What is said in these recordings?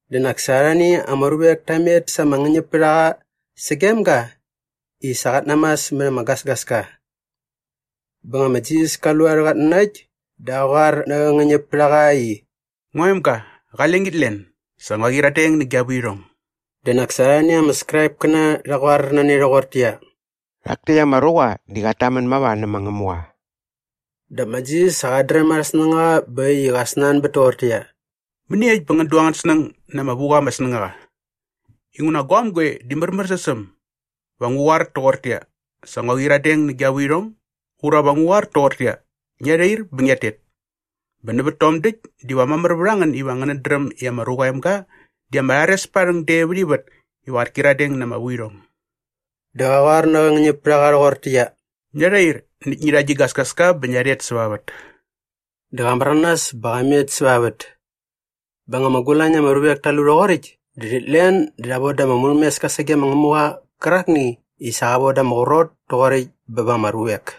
Dä nak sa arhani ama ruvek ta met sa ama ngäñäpärhaqa sagem ga i sa qat namas mät ama gasgaska. Bä nga ma Jisas ka lu arhä qatnanakt dä qa qoar nä qä ngäñäpärhaqa i, “Ngua emga, qale ngit len. Sa ngua qyiradeng nä gia vuirhong.” Dä nak sa arhani ama Skraipkäna rha qoar na ne rhoqortäqyia, “Rhak täkt ama ruqa di qat tamän mava nä ma Ngämuqa.” Dap ma Jisas sa qat dräm arhä snängaqa bä äkt i qa snanbät toqortäqyia, “Mäniekt bä ngän du angän snäng na ama vu qa ama snängaqa? Inguna guaäm goe di märmärsäs mamär sä äm? Va ngu qoar toqortäqyia, ‘Sa ngua qyiradeng nä gia vuirhong’ ura va ngu qoar toqortäqyia, ‘Ngia rhair bä ngiat tet’? Bä nävät tom däkt diva mamär vät a ngän iva ngänät dräm i ma Ruqa aa Emga di ama rhares pät aa rhäng de vät ivät iva qät kyiradeng na ama vuirhong.” Dä qa qoar nä qä ngäñäpärhaqa rhoqortäqyia, “Ngia rhair näkt ngi rha gi gasgaska bä ngia rhet säva vät.” Dä qa märanas bä qa met säva vät. Bä nga ama gulañ na ama ruvek ta lu rhoqoräkt dä rhit len dä rha voda ama murhämeska sage ma Ngämuqa qärakni i sa qa von da ama qrot toqoräkt bä ba ama ruvek.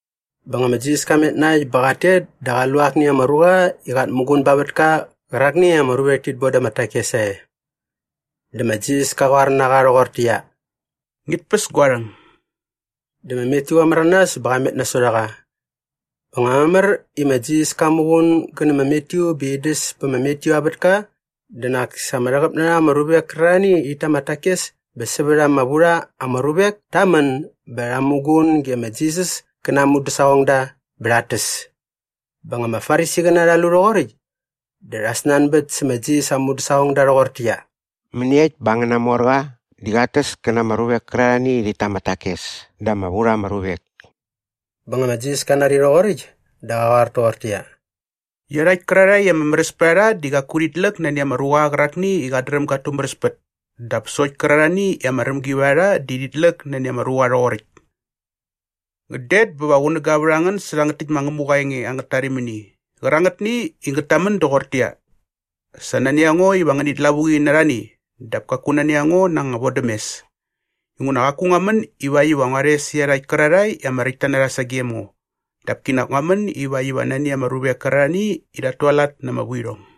Bä nga ma Jisas ka met na äkt bä qat tet dä qa lu akni ama ruqa i qat muqun ba ama vätka qärakni i ama ruvek tit boda ama takes sae. Dä ma Jisas ka qoar na qa rhoqortäqyia, “Ngit päs gua rhäng.” Dä ma Matyu qa märanas bä qa met nasot a qa. Bä nga mamär i ma Jisas kat muqun gä nä ma Matyu bä in däs pä ma Matyu aa vätka dä nak sa ama rhäqäp na rha ama ruvek kärarhani i rhit ta ama takes bä sävät ama vu rha ama ruvek ta män bä rha muqun ge ma Jisas kä na aa mudäsaqongda bä rhat täs. Bä nga ama Farisiqäna rha lu rhoqoräkt dä rha snanbät sä ma Jisas aa mudäsaqongda rhoqortäqyia, “Mäniekt bä angäna morqa di qat täs kä na ama ruvek kärarhani i rhit ta ama takes dä ama vu rha ama ruvek?” Bä nga ma Jisas ka nari rhoqoräkt dä qa qoar toqortäqyia, “Iarhakt kärarhae i ama märäs pät a rha di qaku rhit läk nani ama ruqa qärakni i qat dräm gat tumäräspät dap sokt kärarhani i ama rämgi vät a rha di rhit läk nani ama ruqa rhoqoräkt. Ngän det bä va qunäga vät a ngän sä rhangät täkt ma Ngämuqa aa enge angät tarimini qärangätni i ngät tamän doqortäqyia, ‘Sa nani a ngo iva ngänit lavuqi na arhani dap kaku nani a ngo na anga vodämes.’ Inguna qaku ngua män ivakt iva ngua rhes iarhakt kärarhae i ama räktta na rha sagem ngo dap kinak ngua män ivakt iva nani ama ruvek kärarhani i rhat tualat na ama vuirhong.”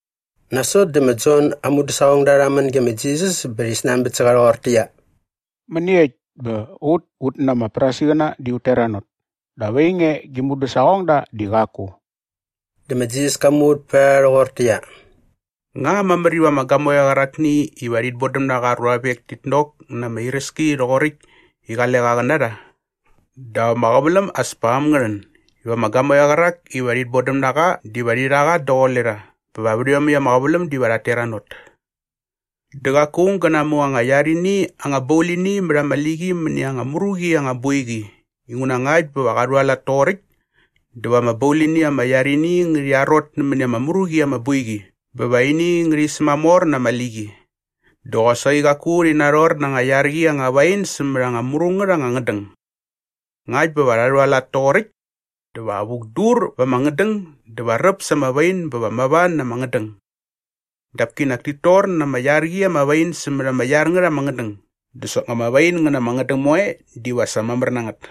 Nasot dä ma Jon aa mudäsaqongda rha män ge ma Jisas bä rhi snanbät sä qa rhoqortäqyia, “Mäniekt bä ut ut na ama Farisiqäna di ut teranot dap ainge gi mudäsaqongda di qaku?” Dä ma Jisas ka muvät pät a rha rhoqortäqyia, “Nga mamär iva ama gamoeqa qärakni iva rhit bodäm na qa aa ruavek tit nok na ama iräski rhoqoräkt i qale qa qä na rha? Dap ama qäväläm as pa äm ngä rhän iva ama gamoeqa qärak iva rhit bodäm na qa diva rhi rha qa daqule rha bä vät iomäkt ama qäväläm diva rhat teranot. “Dä qaku aung gä namu anga iar ini anga baulini mät anga liqi mäni anga mru qi anga boiqi inguna ngakt bä va qa rhualat toqoräkt dä va ama baulini ama iar ini ngärhi arot nämäni ama mru qi ama boiqi bä va ini ngärhi sämamor na ama liqi. “Dä qosaqi qaku rhi narhor na anga iar qi anga wain sämät anga mru ngät anga ngädäng. Ngakt bä va rha rhualat toqoräkt dä va vukdur va ama ngädäng dä va räp sa ama wain bä va mava na ama ngädäng. Dap kinak tit tor na ama iar qi ama wain sämät ama iar ngät ama ngädäng dä soknga ama wain ngä na ama ngädäng moe diva sa mamär na ngät.”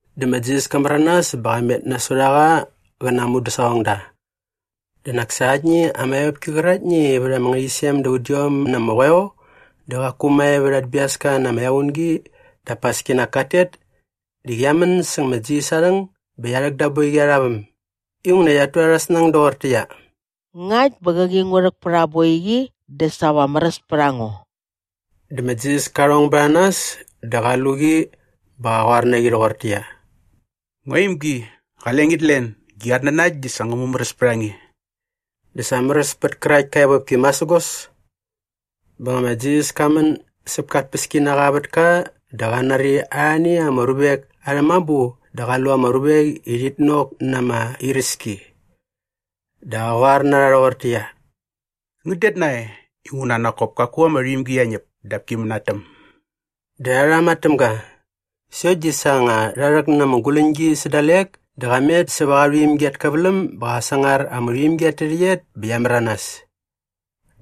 Dä ma Jisas ka märanas bä qa met nasot a qa qä na aa mudäsaqongda. Dä nak sa aktni ama evopki qäraktni i vät ama ngärhäqyisem da udiom na ama qoeo dä qaku mae vät at biaska na ama equngi dap as kinak kat tet di qia män säng ma Jisas aa rhäng bä qia rhäk da aa boiqi arha väm inguna qiat tu arhä snäng doqortäqyia, “Ngakt bä qäqi ngu rhäk pät aa boiqi dä sa va märäs pät a ngo.” Dä ma Jisas ka rhong bät a nas dä qa lu qi bä qa qoar na qi rhoqortäqyia, “Ngua imgi, qale ngit len. Gi qatnanakt di sa ngä mumäräs pät a nge.” Dä sa märäs pät kärakt ka evopki masägos. Bä nga ma Jisas ka män säp ka tpäskinaqa aa vätka dä qa nari arhani ama ruvek arhä mabu dä qa lu ama ruvek i rhit nok na ama iräski. Dä qa qoar na rha rhoqortäqyia, “Ngän det nae inguna nak kop kaku ama rhuimgi qia ñäp dap ki mänatäm.” Dä rha rhama täm ga. Sokt di sa nga rha rhäk na ama guläñgi sä dalek dä qa met säva qa rhuimgi at käväläm bä qa sangar ama rhuimgi at tärhäqyet bä qia märanas.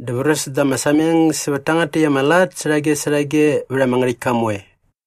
Dä vräs da ama sameng sävät tangät täkt ama lat särhage särhage vät ama ngärhäktka moe.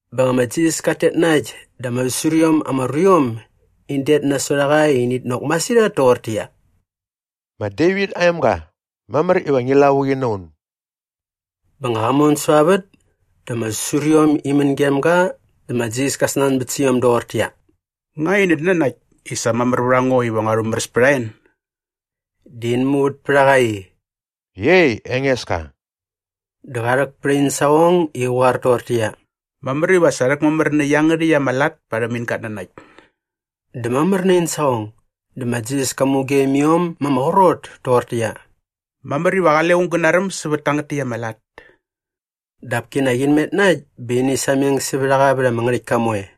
Bä nga ma Jisas kat tet na äkt dä ama säsur iom ama ruiom in det nasot a qa i init nok masirhat toqortäqyia, “Ma Devit aa emga, mamär iva ngi lavuqi na un.” Bä nga qa mon säva vät dä ama säsuriom in män gem ga dä ma Jisas ka snanbät sä iom doqortäqyia, “Ngä inät nanakt i sa mamär vät a ngo iva ngua rhumäräs pät a en?” Dä in muvät pät a qa i, “Iei Engeska.” Dä qa rhäk pät in saqong i qä qoar toqortäqyia, “Mamär iva sa rhäkmamär nä iangärhäkt ama lat parhäm in gatnanakt.” Dä mamär na in saqong. Dä ma Jisas ka mugem iom ma ama qrot toqortäqyia, “Mamär iva qale aung gä naräm sävät tangät täkt ama lat.” Dap kinak in met na äkt bä ini sameng sävät a qa vät ama ngärhäktka moe.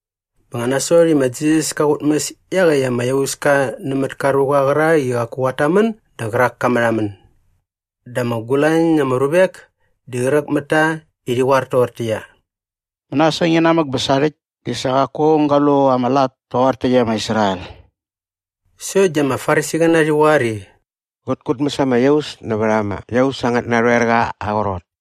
Bä nga nasot i ma Jisas ka qutmäs iaqäkt ama iauska nämät ka ruqa qärak i qaku qat tamän dä qärak ka märhamän. Dä ama gulañ na ama ruvek di qräk mät ta i rhi qoar toqortäqyia, “Mänasäng inamäk bä sarhäkt di sa qaku aung ga lu ama lat toqor täkt e ma Israel.” Sokt di ama Farisiqäna rhi qoar i, “Qät kutmäs ama iaus nävät ama iaus angät narhoerqa aa qrot.”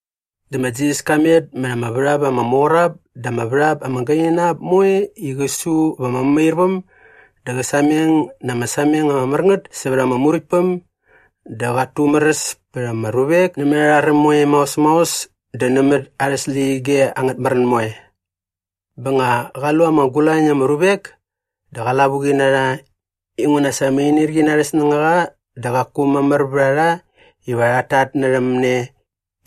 Dä ma Jisas ka met mät ama värhap ama mor ap dä ama värhap ama gaini na ap moe i qä su va ama mämairväm dä qä sameng na ama sameng ama mär ngät sävät ama Muräktpäm dä qat tumäräs pät ama ruvek nämät arhä räm moe maos maos dä nämät arhä släqyige angät märän moe. Bä nga qa lu ama gulañ na ama ruvek dä qa lavuqi na rha inguna sa ama inirqi na arhä snängaqa dä qaku mamär vät a rha iva rhat tatnärhäm ne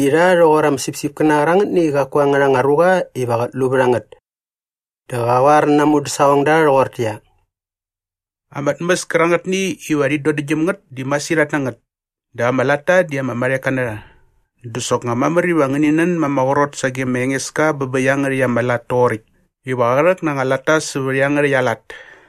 i rha rhoqor ama sipsipkäna qärangätni i qaku angärha anga ruqa iva qät lu vät a ngät. Dä qa qoar na aa mudäsaqongda rhoqortäqyia, “Ama tmäs kärangätni iva rhi dodäktgyäm ngät di masirhat na ngät dap ama latta di ama marheka na rha. Dä soknga mamär iva ngäni nän ma ama qrot sage ma Engeska bä bä iangärhäkt ama lat toqoräkt iva qä rhäk na anga latta sävät iangärhäkt aa lat.”